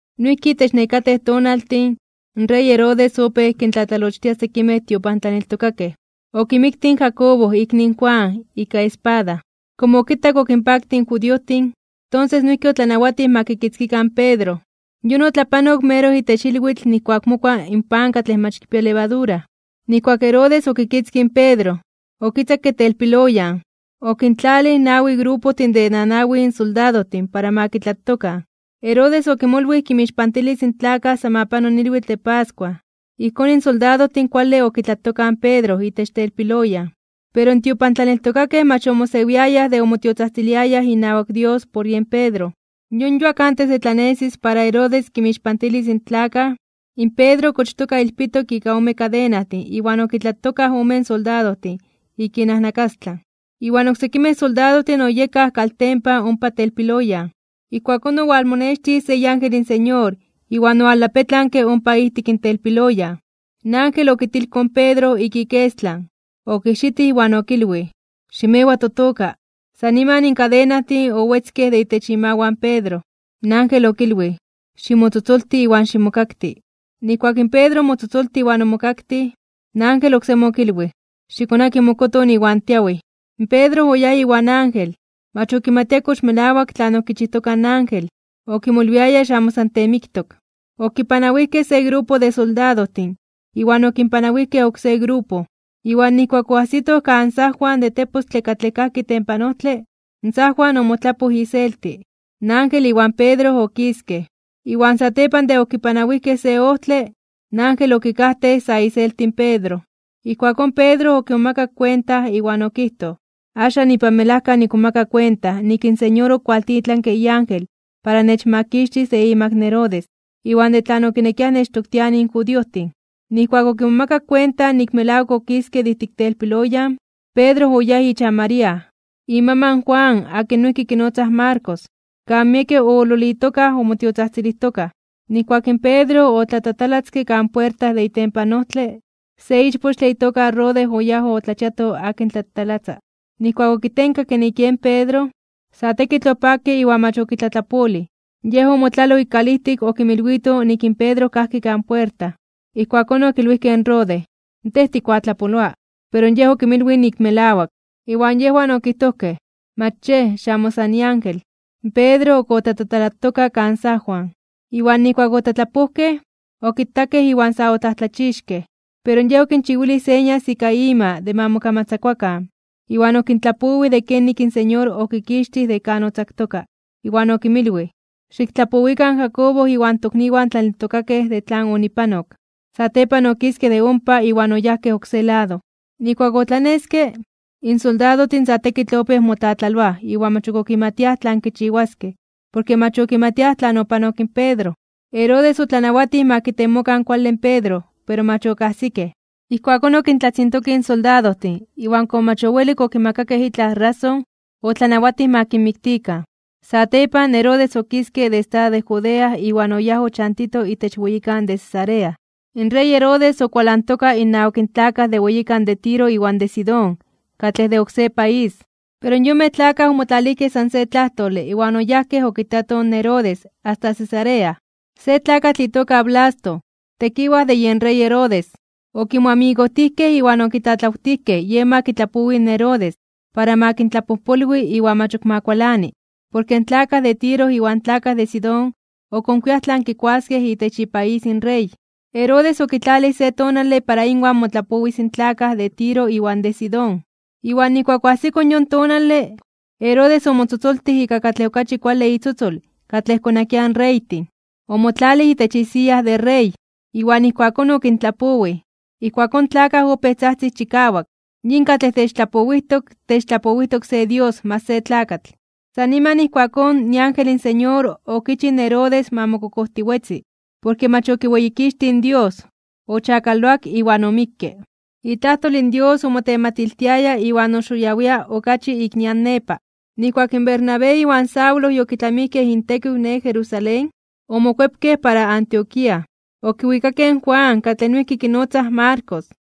Noijki itech nekatej tonaltin, in rey Herodes opéj kintlatlalochtia sekimej tiopantlaneltokakej. Okimiktij in Jacobo ikni in Juan ika espada, komo okitak okinpaktij in judiojtin, tonses noijki otlanawatij ma kikitzkikan in Pedro. Yon otlapanok meroj itech ilwitl nijkuak mokua in pan katlej mach kipia levadura. Nijkuak Herodes okitzkij in Pedro, okitzakke telpiloyan. Okintlalij nawi grupojtin de nanawin soldadojtin para ma kitlatokan. Herodes okimolwij kinmixpantilis in tlakaj san ma pano in ilwitl de pascua. Ijkón in soldadojtin kuale okitlatokaj in Pedro itech telpiloyan. Pero in tiopantlaneltokakej mach ok omosewiayaj de omotiotzajtziliayaj inawak Dios por yen Pedro. Yon yuak antes de tlanesis para Herodes kinmixpantilis in tlakaj, in Pedro okochtoka ilpitok ika ome kadenajtin iwan okitlatokaj omen soldadojtin ik inajnakastlan, iwan oksekimej soldadojtin oyekaj kaltempan ompa telpiloyan. Ijkuakón owalmonextij se iángel in Señor iwan owaltlapetlanke ompa ijtik telpiloyan. In ángel okitilkoj in Pedro ik ikestlan, okijxitij iwan okilwij: ―¡Ximewa totoka! San niman in kadenajtin owetzkej de itech imawan Pedro. In ángel okilwij: ―Ximotzotzolti iwan ximokakti. Nijkuak in Pedro omotzotzoltij iwan omokaktij, in ángel oksemi okilwij: ―Xikonaki mokoton iwan tiawij. Pedro oyáj iwan ángel. Mach okimatia kox melawak tlan okichijtoka in ángel. Okimolwiaya xamo san kiteemiktok. Okipanawijkej se grupo de soldadojtin iwan okipanawijkej oksé grupo, iwan nijkuak oajsitoj kan sajwan de tepostle katlej kajki itempan ojtle, in sajwan omotlapoj iselti. In ángel iwan Pedro okiskej, iwan satepan de okipanawijkej se ojtle, in ángel okikajtej sa iselti in Pedro. Ijkuakón Pedro okimomakak kuenta, iwan okijtoj: ―Axan ipan melajka nikmomaka kuenta nik in Señor okualtitlanke iángel para nechmakixtis de imak Herodes, iwan de tlan okinekiaj nechtoktianij in judiojtin. Nijkuak okimomakak kuenta nik melawak okiske de ijtik telpiloyan, Pedro oyáj ichan María, imaman in Juan akin noijki kinotzaj Marcos, kan miekej oololitokaj omotiotzajtzilijtokaj. Nijkuak in Pedro otlatatalatzke kan puerta de itempan ojtle, se ichpochtle itoka Rode oyáj otlachiato akin tlatatalatza. Nijkuak okitenkakke nik yen Pedro, sa tekitl opakke iwan mach okitlatlapolij, yej omotlaloj ik kalijtik okinmilwito nik in Pedro kajki kan puerta. Ijkuakón okilwijkej in Rode: ―¡Tej tikuatlapoloa! Pero yej okinmilwij nik melawak. Iwan yejwan okijtojkej: ―Mach yej, xamo san iángel. Pedro ok otlatatalatoka kan sajwan. Iwan nijkuak otlatlapojkej, okitakej iwan sa otlajtlachixkej (omomajmawtijkej). Pero yej okinchiwilij señas ika ima de ma mokamatzakuakan, iwan okintlapowij de kenik in Señor okikixtij de kan otzaktoka. Iwan okinmilwij: ―Xiktlapowikan in Jacobo iwan tokniwan tlaneltokakej de tlan onipanok. Satepan okiske de ompa iwan oyáj oksé lado. Nijkuak otlaneske, in soldadojtin sa tekitl opéj motlatlaloaj iwan mach ok okimatiaj tlan kichiwaskej porke mach okimatiaj tlan opanok in Pedro. Herodes otlanawatij ma kitemokan kuale in Pedro pero mach okajsikej. Ijkuakón okintlatzintokij in soldadojtin iwan komo mach owelik okimakakej itlaj rason, otlanawatij ma kinmiktikan. Satepan, Herodes okiske de estado de Judea iwan oyáj ochantito itech weyikan de Cesarea. In rey Herodes okualantoka innawak in tlakaj de weyikan de Tiro iwan de Sidón katlej de oksé país, pero yonmej tlakaj omotlalijkej san se tlajtole iwan oyajkej okitatoj in Herodes asta Cesarea. Se tlakatl itoka Blasto, tekiwaj de yen rey Herodes, okimoamigojtijkej iwan okitlatlawtijkej yen ma kitlapowi in Herodes para ma kintlapojpolwi iwan mach ok ma kualani, porke in tlakaj de Tiro iwan tlakaj de Sidón okonkuiaj tlan kikuaskej itech ipaís in rey. Herodes okitlalij se tonale para inwan motlapowis in tlakaj de Tiro iwan de Sidón. Iwan nijkuak oajsiko yon tonale, Herodes omotzotzoltij ika katlej okachi kuale itzotzol katlej konakiaj in reytin, omotlalij itech isiya de rey, iwan ijkuakón okintlapowij. Ijkuakón in tlakaj opéj tzajtzij chikawak: ―¡Yin katlej techtlapowijtok, techtlapowijtok se dios mach se tlakatl! San niman ijkuakón, iángel in Señor okichij in Herodes ma mokokojtiwetzi, porke mach okiweyikixtij in Dios, ochakaloak iwan omikke. Itlajtol in Dios omotematiltiaya iwan oxoyawia (oxitinia) okachi ik nian nepa. Nijkuak in Bernabé iwan Saulo yokitlamijkej intekiw ne Jerusalén, omokuepkej para Antioquía. Okiwikakej in Juan katlej noijki kinotzaj Marcos.